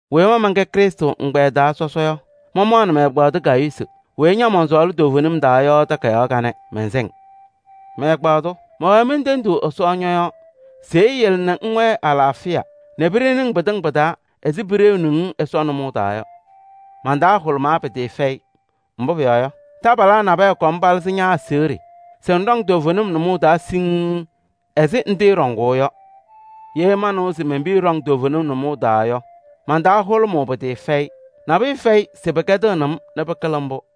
Weyi ma mɛnkɛ Krɩstʋ ɛgbɛyɛ taa sɔsɔ yɔ, mamaɣnɩ mɛ-ɛgbaadʋ Gayuusi weyi ña mɔnsɔɔlɩ toovenim taa yɔ takayaɣ kanɛ, mɛnsɛ-ŋ. Mɛ-ɛgbaadʋ! Mɛwɛɛ mentendiɣ Ɛsɔ ñɔ-yɔɔ se eyele nɛ ŋwɛɛ alaafɩya nɛ piɖeni-ŋ pɩtɩŋa pɩ-taa ɛzɩ piɖeuni-ŋ Ɛsɔ nʋmɔʋ taa yɔ. Man-taa hʋlʋmaa pɩtɩɩfɛyɩ, mbʋ pʋyɔɔ yɔ, taabalaa nabɛyɛ kɔm palɩzɩ ña-aseɣɖe se ŋɖɔŋ toovenim nʋmɔʋ taa siŋŋ ɛzɩ ŋtɩɩɖɔŋʋʋ yɔ. Ye manɩwa se men-piya ɖɔŋ toovenim nʋmɔʋ taa yɔ, man-taa hʋlʋmʋʋ pɩtɩɩfɛyɩ. Nabʋyʋ fɛyɩ se pɩkɛdɩɣnɩ-m nɛ pɩkɩlɩ mbʋ.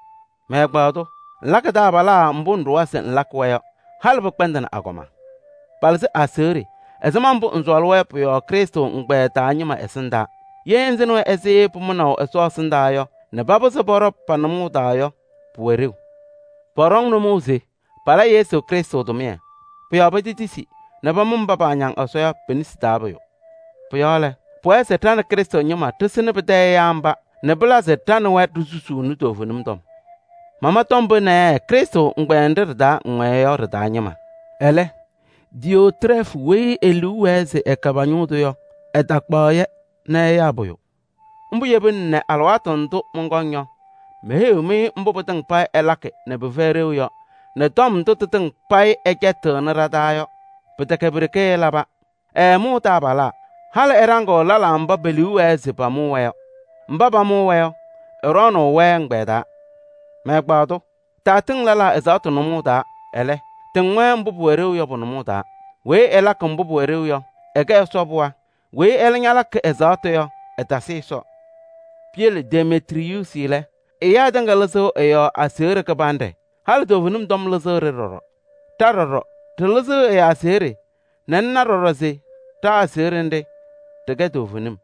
Mɛ-ɛgbaadʋ! Ŋlakɩ taabalaa mbʋ ŋɖʋwa se ŋlakɩ-wɛ yɔ, halɩ pɩkpɛndɩnɩ agɔma. Palɩzɩ aseɣɖe ɛzɩma mbʋ ŋsɔɔlɩ-wɛ yɔ pʋ-yɔɔ Krɩstʋ ɛgbɛyɛ taa ñɩma ɛsɩndaa. Ye ŋsɩnɩ-wɛ ɛzɩ pʋmʋnaʋ Ɛsɔ ɛsɩndaa yɔ nɛ papɩzɩ pɔɖɔ pa-nʋmɔʋ yɔ, pʋwɛɣ ɖeu. Pɔɖɔŋ nʋmɔʋ se pala Yesu Krɩstʋ tʋmɩyɛ. Pʋ-yɔɔ petetisi nɛ pamʋ mba paañaŋ Ɛsɔ yɔ pe-nesi taa pʋyʋ. Pʋ-yɔɔ lɛ, pʋwɛɛ se ɖa Krɩstʋ ñɩma ɖɩsɩnɩ pɩtɛ ɛyaa mba nɛ pɩla se ɖa nɛ wɛ ɖisusuuni toovenim tɔm. Mama tɔm pee naayɛ Krɩstʋ ɛgbɛyɛ nɖɩ ɖɩ-taa ŋwɛɛ yɔ ɖɩ-taa ñɩma. Ɛlɛ, Diyootrɛɛfʋ weyi e-liu wɛɛ se ɛkɛ pa-ñʋʋ tʋ yɔ, ɛtakpaɣ-yɛ nɛ ɛyaa pʋyʋ. Mbʋ yebina nɛ alɩwaatʋ ndʋ mɔnkɔŋ yɔ, meheyiɣ-mɩ mbʋ pɩtɩŋa payɩ ɛlakɩ nɛ pɩfɛyɩ ɖeu yɔ, nɛ tɔm ndʋ tɩtɩŋa payɩ ɛcɛtɩɣnɩ ɖa-taa yɔ. Pɩtɛkɛ pi-ɖeke ɛlaba. Ɛɛmʋʋ taabalaa, halɩ ɛɖaŋɩɣ lɛlaa mba paba liu wɛɛ se pamʋ-wɛ yɔ. Mba pamʋʋ-wɛ yɔ, ɛɖɔɔnʋʋ-wɛ ɛgbɛyɛ taa. Mɛ-ɛgbaadʋ! Taatɩŋ lɛlaa ɛzaɣtʋ nʋmɔʋ taa, ɛlɛ, tɩŋ-wɛ mbʋ pʋwɛ ɖeu yɔ pʋ-nʋmɔʋ taa. Weyi ɛlakɩ mbʋ pʋwɛ ɖeu yɔ, ɛkɛ Ɛsɔ pɩɣa. Weyi ɛlɛ ñalakɩ ɛzaɣtʋ yɔ, ɛtasɩ Ɛsɔ. Piyele Demetriyuusi lɛ, ɛyaa tɩŋa lɩzɩɣ ɛ-yɔɔ aseɣɖe kɩbanɖɛ, halɩ toovenim tɔm maɣmaɣ lɩzɩɣ-ɖɩ ɖɔɖɔ. Ɖa ɖɔɖɔ, ɖɩlɩzɩɣ ɛ-aseɣɖe nɛ ŋna ɖɔɖɔ se ɖa-aseɣɖe nɖɩ, ɖɩkɛ toovenim.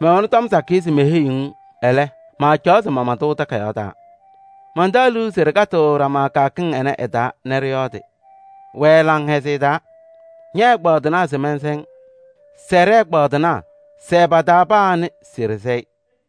Mɛwɛnɩ tɔm sakɩyɛ se meheyiɣ-ŋ, ɛlɛ, maacaɣ se mama-tʋ takayaɣ taa. Mantaɣ liu se ɖɩkatɩɣ ɖama kɩyakɩŋ ɩnɛ ɩ-taa nɛ ɖɩyɔɔdɩ. Wɛɛ laŋhɛzɩyɛ taa! Ñɛ-ɛgbaadɩnaa se mɛnsɛ-ŋ. Sɛɛ ɖɛ-ɛgbaadɩnaa, sɛɛ paa pa-taa weyi se ɖɩsɛ-ɩ.